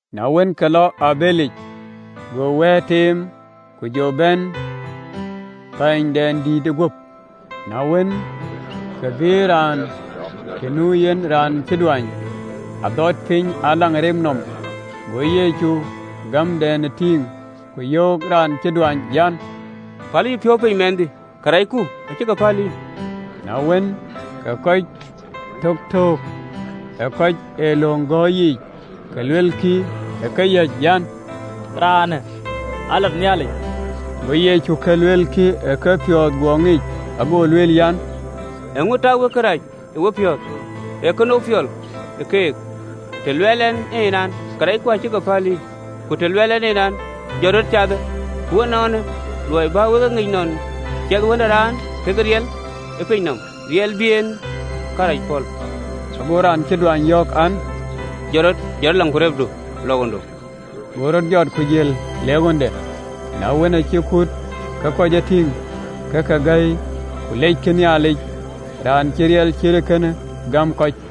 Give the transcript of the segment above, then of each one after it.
Na wën, ke lɔ ë abëlic, go wɛ̈ɛ̈r teem, ku jɔ bɛ̈n pänydɛndït guöp. Na wën, ke ke bïï raan të nu yen, raan cï duany, adhɔt piny ë agen nɔm, go Yecu gämden tïŋ, ku yöök raan cï duany an, “Pälë yïpiɔ̈u piny, mɛnhdï, karɛcku acï ke päl yïn.” Na wën, ke kɔc töktöök ë kɔc ë löŋ gɔ̈ɔ̈r yiic, ke luelkï ë keyäc an, “Raanë alat Nhialic!” Go Yecu ka luekï ë kepiɔ̈ɔ̈th guɔ ŋic, ago lueel an, “Eeŋö tak wek kërac ë wepiɔ̈ɔ̈th?” Ee kënou piɔl ë keek, të luɛɛl ɛn en, an, Karɛcku acï ke päl yïn, ku të luɛɛl ɛn en, an, Jɔt rɔt, cathë? Ku nɔɔnë, luɔi bä wek e ŋic nɔn ciɛthë Wën ë Raan ke riɛl ë piny nɔm riɛl bï en karɛc pɔ̈l, ago raan cï duany yɔ̈ɔ̈k an, “Jɔt rɔt, jɔt agendu, lɔ baaidu.” Go rɔt jɔt, ku jël le ɣönde. Na wën, acï kuut ke kɔc e tïŋ, ke ke gäi, ku leckï Nhialic, Raan cï riɛl cït ee kënë gam kɔc.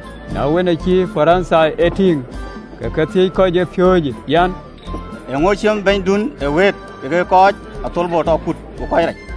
Na wën, acï Parithai e tïŋ, ke ke thiëc kɔckɛn ë piööcë, an, “Eeŋö ciëmë Bɛ̈nyduön ë wëët kekë kɔc ë athölbö tɔ kut ku kɔc rac?”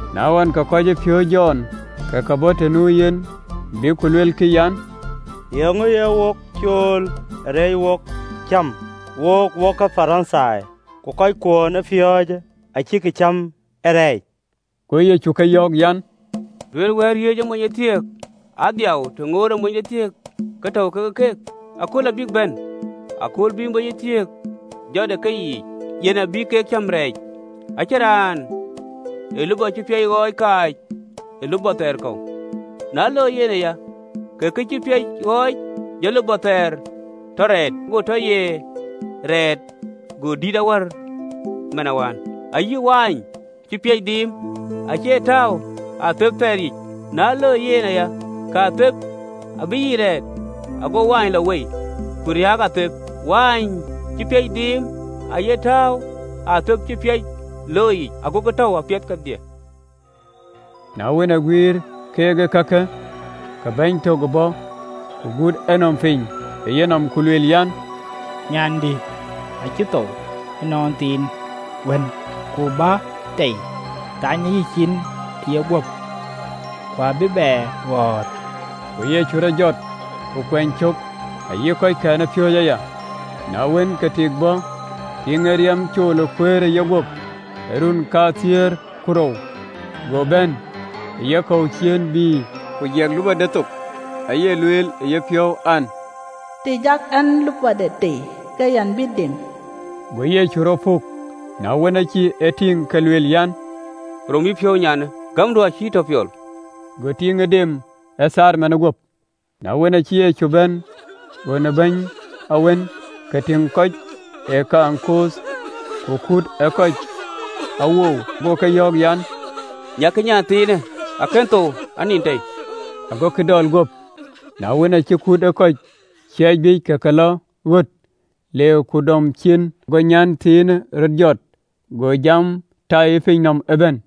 Na wën, ke kɔcpiööcë Jɔn ke ke bɔ̈ të nu yen, bïk ku luelkï an, “Eeŋö ye wok cool ë reec cäm, wok wokë Parithai, ku kɔckuön ë piööcë acïkï cäm ee rɛɛc?” Go Yecu ke yɔ̈ɔ̈k an, “Duëër wɛ̈ɛ̈t riëëc ë monythiëk aa dhiau, të ŋootë monythiëk ke tɔ̈u ke keek? Akööl abïk bɛ̈n, akööl bï monythiëk jɔt ë keyiic, yen abï kek cäm rɛɛc. “Acïn raan ee lupɔ cï piac ɣɔɔc kaac ë lupɔ thɛɛr kɔ̈u, na loi yen aya, kë cï piac ɣɔɔc abï lupɔ thɛɛr tɔ rɛɛt, ago të cï rɛɛt go dït awär man wään. Ayï mɔ̈n cï piac dhiim acie tääu ë athep thɛɛr yiic, na loi yen aya, ke atheep abïk yiic rɛɛt, ago mɔ̈u lɔ wei, ku riääk atheep, mɔ̈u cï piac dhiim aye tääu ë atheep cï piac looi yiic, agokï tɔ̈u apiɛth kedhie.” Na wën, aguïïr keek ee kakë, ke bɛ̈ny tök bɔ̈, ku gut enɔm piny ë yenɔm, ku lueel an, “Nyandï acï thou ënɔnthiin wënë, ku bä tei, thanyë yïcin ë yeguöp, ku abï bɛ ɣɔ̈ɔ̈r. Go Yecu rɔt jɔt, ku kuɛny cök, ayï kɔckɛn ëpiööcë aya. Na wën, ke tik bɔ̈, tiiŋ ë riɛm cool ee kuëër ë yeguöp ë run kathiëër ku rou, go bɛ̈n ë yekɔ̈u ciëën, bï ku jiɛk lupɔde thok, aye lueel ë yepiɔ̈u an, “Të jak ɛn lupɔde tei, ke yɛn bï dem.” Go Yecu rɔt puk, na wën, aacï e tïŋ, ke lueel an, “Rom yïpiɔ̈u, nyanë, gämdu acï yï tɔ piɔl.” Go tiiŋë dem ë thaar manë guöp. Na wën, acï Yecu bɛ̈n ɣön ë bɛ̈ny awën, ke tïŋ kɔc ë kɛŋ kooth ku kut ë kɔc awou, go ke yɔ̈ɔ̈k an, “Nyaikï, nyanthiinë akën thou, anin tei.” Agokï dɔl guöp. Na wën, aacï kut ë kɔc ciɛɛc biic, ke lɔ ɣöt, le ku dɔm ciin, go nyanthiinë rɔt jɔt. Go jamë tɛɛi ë pinyë nɔm ëbɛ̈n.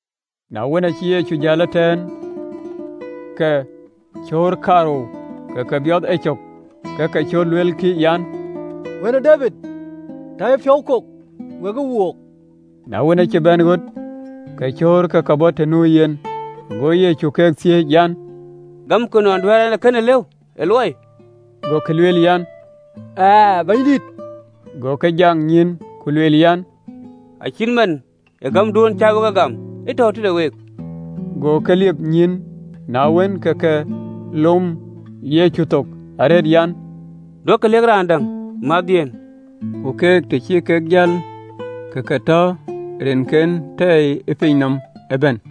Na wën, acï Yecu jäl ëtɛ̈ɛ̈n, ke cöör kaarou ke ke biɔth ecök, ke ke cöt, luelkï an, “Wën ë Debid, tɔ yïpiɔ̈u kok wekë wook.” Na wën, acï bɛ̈n ɣöt, ke cöör ë ke bɔ̈ të nu yen, go Yecu ke thiëëc an, “Gamkï nɔn duɛ̈ɛ̈r ɛn ee kënë lëu ë luɔi?” Gokï lueel an, “Ɣɛɛ, Bɛ̈nydït.” Go ke jak nyïïn, ku lueel an, “Acït man ë gämduön cä wek gam, ë tɔ̈u tëde week.” Go ke liep nyïïn. Na wën, ke ke lom Yecu thook arëët an, “Duökï lëk raan däŋ mäthdhiëën.” Ku keek, të cï kek jäl, ke ke tɔ rinke tɛɛi ë pinyë nɔm ëbɛ̈n.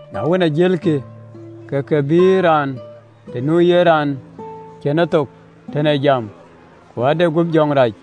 Na wën, ajëlkï, ke ke bïï raan të nu yen raan cïn ethok tën ee jam, ku ade guöp jɔŋ rac.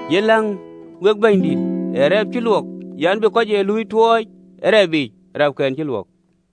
Yen läŋ wek Bɛ̈nydït ë rɛɛp cï luɔk an, bï kɔc ee luui tuɔɔc ë rap yiic rɛɛpkɛn cï luɔk.”